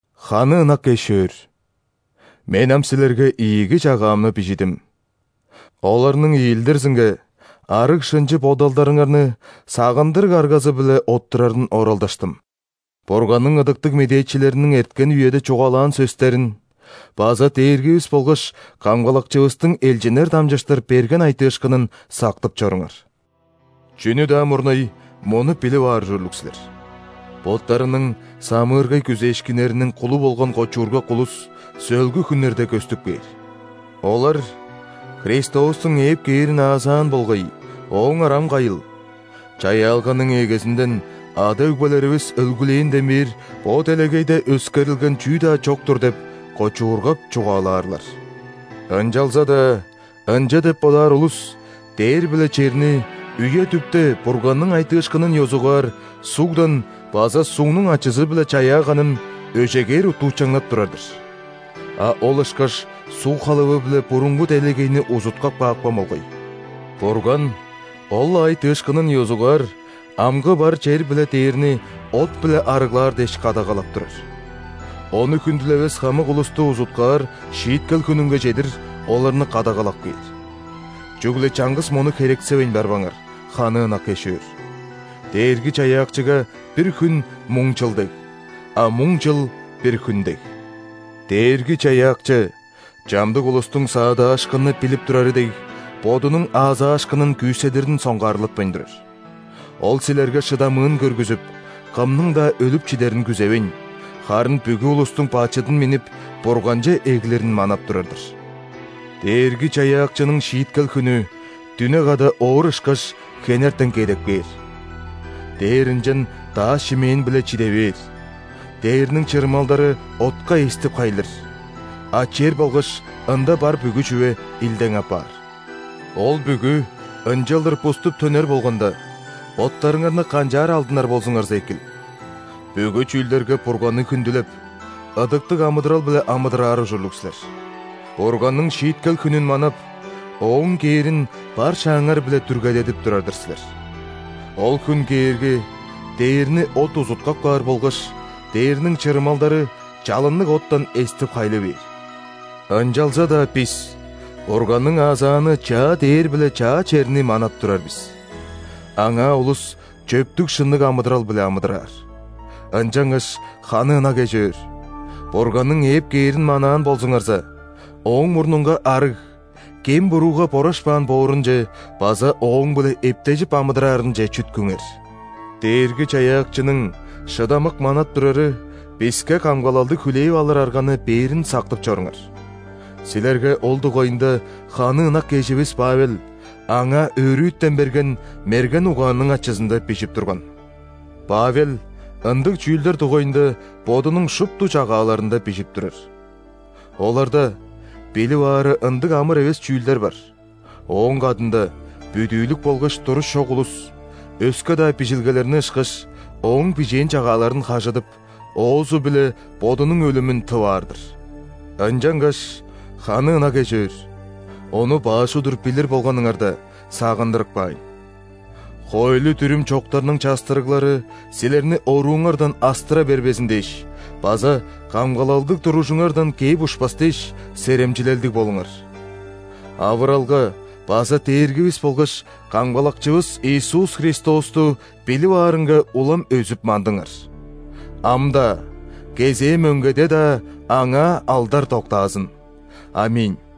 Ханы ынак эш-өөр! Мен ам силерге ийиги чагаамны бижидим. Оларның иелдирзинге арыг-шынчы бодалдарыңарны сагындырыг аргазы-биле оттурарын оралдаштым. Бурганның ыдыктыг медээчилериниң эрткен үеде чугаалаан сөстерин база Дээргивис болгаш Камгалакчывыстың элчиннер дамчыштыр берген айтыышкынын сактып чоруңар. Чүнү-даа мурнай мону билип аар ужурлуг силер: боттарының самыыргай күзээшкиннериниң кулу болган кочуургак улус сөөлгү хүннерде көстүп кээр. Олар: «Христостуң ээп кээрин аазаан болгай, Ооңар ам кайыл? Чаяалганың эгезинден, ада-өгбелеривис өлгүлээнден бээр бо делегейде өскерилген чүү-даа чок-тур» – деп кочуургап чугаалаарлар. Ынчалза-даа ынча деп бодаар улус дээр биле черни үе-дүпте Бурганның айтыышкынын ёзугаар сугдан база сугнуң ачызы-биле чаяаганын өжегээр уттуучаңнап турар-дыр. А ол ышкаш суг халавы-биле бурунгу делегейни узуткап каапкан болгай. Бурган ол-ла айтыышкынын ёзугаар амгы бар чер биле дээрни от-биле арыглаар дээш кадагалап турар. Ону хүндүлевес хамык улусту узуткаар шииткел хүнүнге чедир оларны кадагалап кээр. Чүгле чаңгыс мону херексевейн барбаңар, ханы ынак эш-өөр: Дээрги-Чаяакчыга бир хүн муң чыл дег, а муң чыл – бир хүн дег. Дээрги-Чаяакчы, чамдык улустуң саадаашкынны билип турары дег, Бодунуң аазаашкынын күүседирин соңгаарлатпайн турар. Ол силерге шыдамыын көргүзүп, кымның-даа өлүп чидерин күзевейн, харын бүгү улустуң бачыдын миннип, Бурганче эглирин манап турар-дыр. Дээрги-Чаяакчының шииткел хүнү, дүне када оор ышкаш, хенертен кедеп кээр. Дээр ынчан дааш-шимээн-биле чиде бээр, дээрниң чырымалдары отка эстип-хайлыр, а чер болгаш ында бар бүгү чүве илдең апаар. Ол бүгү ынчалдыр буступ төнер болганда, боттарыңарны канчаар алдынар болзуңарза экил? Бүгү чүүлдерге Бурганны хүндүлеп, ыдыктыг амыдырал-биле амыдыраар ужурлуг силер. Бурганның шииткел хүнүн манап, ооң кээрин бар шааңар-биле дүргедедип турар-дыр силер. Ол хүн кээрге, дээрни от узуткап каар болгаш дээрниң чырымалдары чалынныг оттан эстип-хайлы бээр. Ынчалза-даа бис Бурганның аазааны чаа дээр биле чаа черни манап турар бис. Аңаа улус чөптүг-шынныг амыдырал-биле амыдыраар. Ынчангаш, ханы ынак эш-өөр, Бурганның ээп кээрин манаан болзуңарза, Ооң мурнунга арыг, кем-бурууга борашпаан боорунче база Ооң-биле эптежип амыдыраарынче чүткүңер. Дээрги-Чаяакчының шыдамык манап турары биске камгалалды хүлээп алыр арганы бээрин сактып чоруңар. Силерге ол дугайында ханы ынак эживис Павел аңаа өрүтен берген мерген угаанның ачызында бижип турган. Павел ындыг чүүлдер дугайында бодунуң шупту чагааларында бижип турар. Оларда билип аары ындыг амыр эвес чүүлдер бар, ооң кадында бүдүүлүк болгаш туруш чок улус, өске-даа Бижилгелерни ышкаш, ооң бижээн чагааларын хажыдып, оозу-биле бодунуң өлүмүн тып аар-дыр. Ынчангаш, ханы ынак эш-өөр, ону баш удур билир болганыңарда, сагындырып каайн: хоойлу-дүрүм чоктарның частырыглары силерни орууңардан астыра бербезин дээш база камгалалдыг туружуңардан кээп ушпас дээш, серемчилелдиг болуңар. Авыралга база Дээргивис болгаш Камгалакчывыс Иисус Христосту билип аарынга улам өзүп-мандыңар. Ам-даа, кезээ мөңгеде-даа Аңаа алдар доктаазын! ·Аминь.